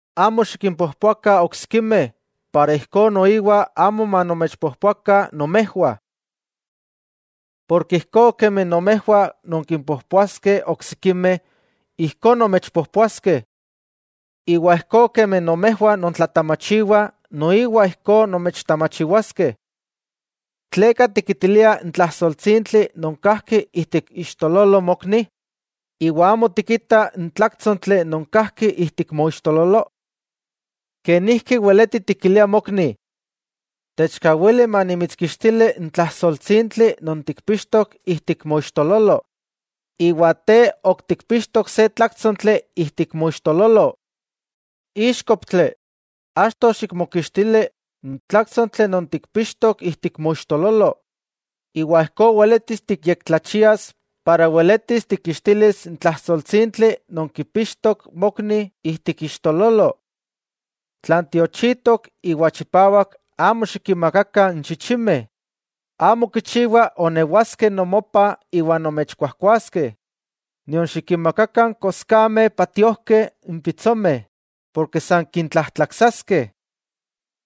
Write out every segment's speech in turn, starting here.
'Amo xikimpojpoakah oksikimeh, ijkó noiwa amo manomechpojpoakah nomejwah. Porke ijkó kemi nomejwah nonkimpojpoaskeh oksikimeh, ijkó nomechpojpoaskeh. Iwa ijkó kemi nomejwah nontlatamachiwah, noiwa ijkó nomechtamachiwaskeh. ¿Tleka tikitilia n tlajsoltsintli non kajki ijtik iixtololo mokni, iwa amo tikita n tláktsontli non kajki ijtik moixtololo? ¡Kenijki weleti tikilia mokni: “Techkawili manimitskixtili n tlajsoltsintli non tikpixtok ijtik moixtololo,” iwa te ok tikpixtok se tláktsontli ijtik moixtololo! ¡Íxkoptli! Achto xikmokixtili n tláktsontli non tikpixtok ijtik moixtololo, iwa ijkó weletis tiyektlachias iwa weletis tikkixtilis n tlajsoltsintli non kipixtok mokni ijtik iixtololo. 'Tlan tiochitok iwa chipawak, amo xikinmakakah n chichimeh, amo kichiwa onewaskeh nomopah iwa nomechkuajkuaskeh. Nion xikinmakakah n koskameh patiojkeh n pitsomeh porke san kintlajtlaksaskeh.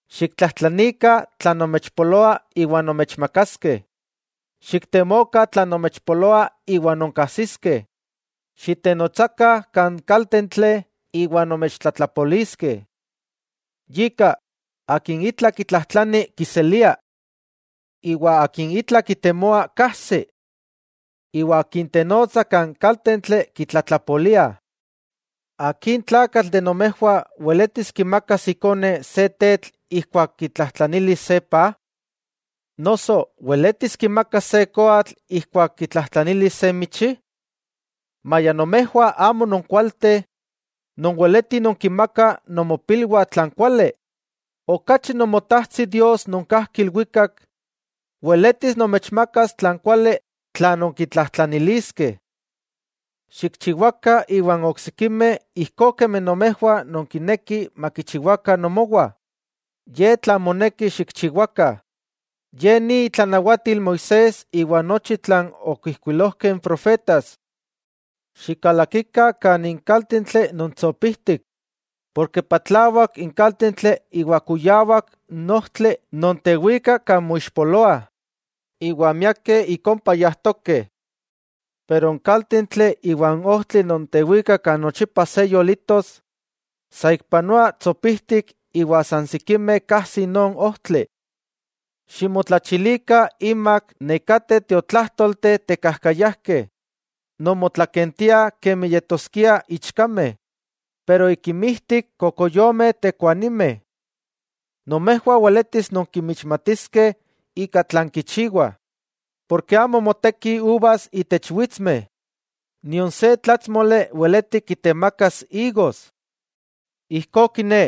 'Xiktlajtlanikah tlan nomechpoloa iwa nomechmakaskeh. Xiktemokah tlan nomechpoloa iwa nonkajsiskeh, xitenotsakah kan kaltentli iwa nomechtlatlapoliskeh. Yika, akin itla kitlajtlani, kiselia. Iwa akin itla kitemoa, kajsi. Iwa akin tenotsa kan kaltentli, kitlatlapoliah. '¿Akin tlakatl weletis kimakas ikone se tetl ijkuak kitlajtlanilis se paj? Noso, ¿weletis kimakas se koatl ijkuak kitlajtlanilis se michi? Maya nomejwah amo nonkualteh, nonweleti nonkinmakah nomopilwah tlan kuali, ¡okachi Nomotajtsi Dios non kajki ilwikak, weletis nomechmakas tlan kuali tla nonkitlajtlaniliskeh! 'Xikchiwakah iwan oksikimeh ijkó kemi nomejwah nonkinekih makichiwakah nomowah, ye tlan moneki xikchiwakah. Ye ni itlanawatil Moisés iwa nochi tlan okijkuilojkeh n profetas. 'Xikalakikah kan ik kaltentli non tsopijtik, porke patlawak n kaltentli iwa kuyawak n ojtli non tewika kan moixpoloah, iwa miakeh ik ompa yajtokeh. Pero n kaltentli iwa n ojtli non tewika kan nochipa se yolitos, saikpanoa tsopijtik iwa san sikimeh kajsi non ojtli. 'Ximotlachilikah inmak nekateh tiotlajtolteh tekajkayajkeh, non motlakentiah kemi yetoskiah ichkameh, pero ik inmijtik kokoyomeh tekuanimeh. Nomejwah weletis nonkinmixmatiskeh ika tlan kichiwah, porke amo motekih uvas itech witsmeh, nion se tlátsmoli weleti kitemakas igos. Ijkó kiné,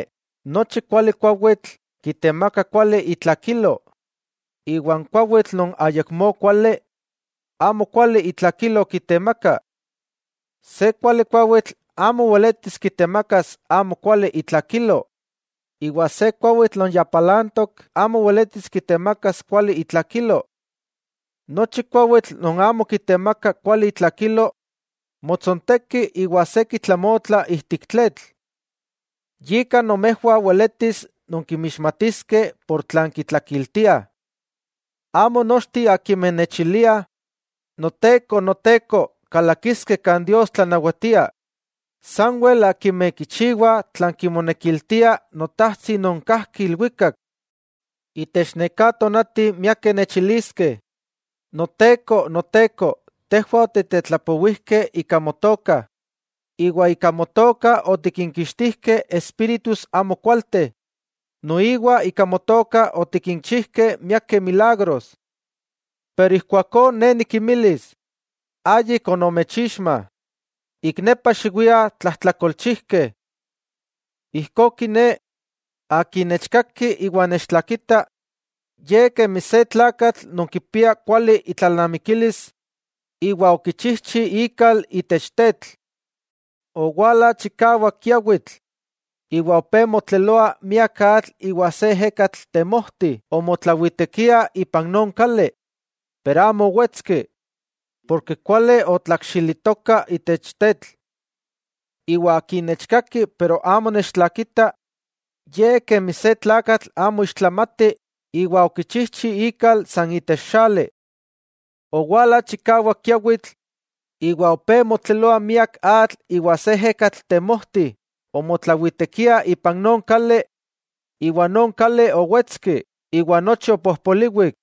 nochi kuali kuawitl, kitemaka kuali itlakilo, iwa n kuawitl non ayakmó kuali, amo kuali itlakilo kitemaka. Se kuali kuawitl amo weletis kitemakas amo kuali itlakilo, iwa se kuawitl non ya palantok amo weletis kitemakas kuali itlakilo. Nochi kuawitl non amo kitemaka kuali itlakilo, motsojtsonteki iwa se kitlamotla ijtik tletl. Yika nomejwah weletis nonkinmixmatiskeh ika tlan kitlakiltiah. 'Amo nochteh akimeh nechiliah: “¡Noteko, Noteko!”, kalakiskeh kan Dios tlanawatia. Sanwel akimeh kichiwah tlan kimonekiltia Notajtsi non kajki ilwikak. Itech neká tonati, miakeh nechiliskeh: “¡Noteko, Noteko!, tejwah otitetlapowijkeh ika Motoka iwa ika Motoka otikinkixtijkeh espíritus amokualteh, noiwa ika Motoka otikinchijkeh miakeh milagros.” Ijkuakó Ne nikinmilis: “¡Ayik onomechixma! ¡Ik nepa xiwiah, tlajtlakolchijkeh!” 'Ijkó kiné, akin nechkaki iwa nechtlakita, ye kemi se tlakatl non kipia kuali itlalnamikilis, iwa okichijchi ikal itech tetl. Owala chikawak kiawitl, iwa opé motleloa miak atl iwa se ejekatl temojti omotlawitekia ipan non kali, pero amo owetski, porke kuali otlakxilitoka itech tetl. Iwa akin nechkaki iwa amo nechtlakita, ye kemi se tlakatl amo ixtlamati iwa okichijchi ikal san itech xali. Owala chikawak kiawitl, iwa opé motleloa miak atl iwa se ejekatl temojti omotlawitekia ipan non kali, iwa non kali owetski iwa nochi opojpoliwik.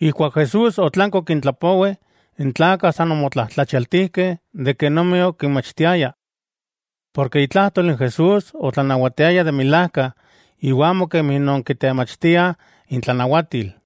Ijkuak Jesús otlanki okintlapowi, n tlakah san omotlajtlachialtijkeh kenomi okinmachtiaya. Porke itlajtol n Jesús otlanawatiaya de milajka, iwa amo kemi non kitemachtiah intlanawatil.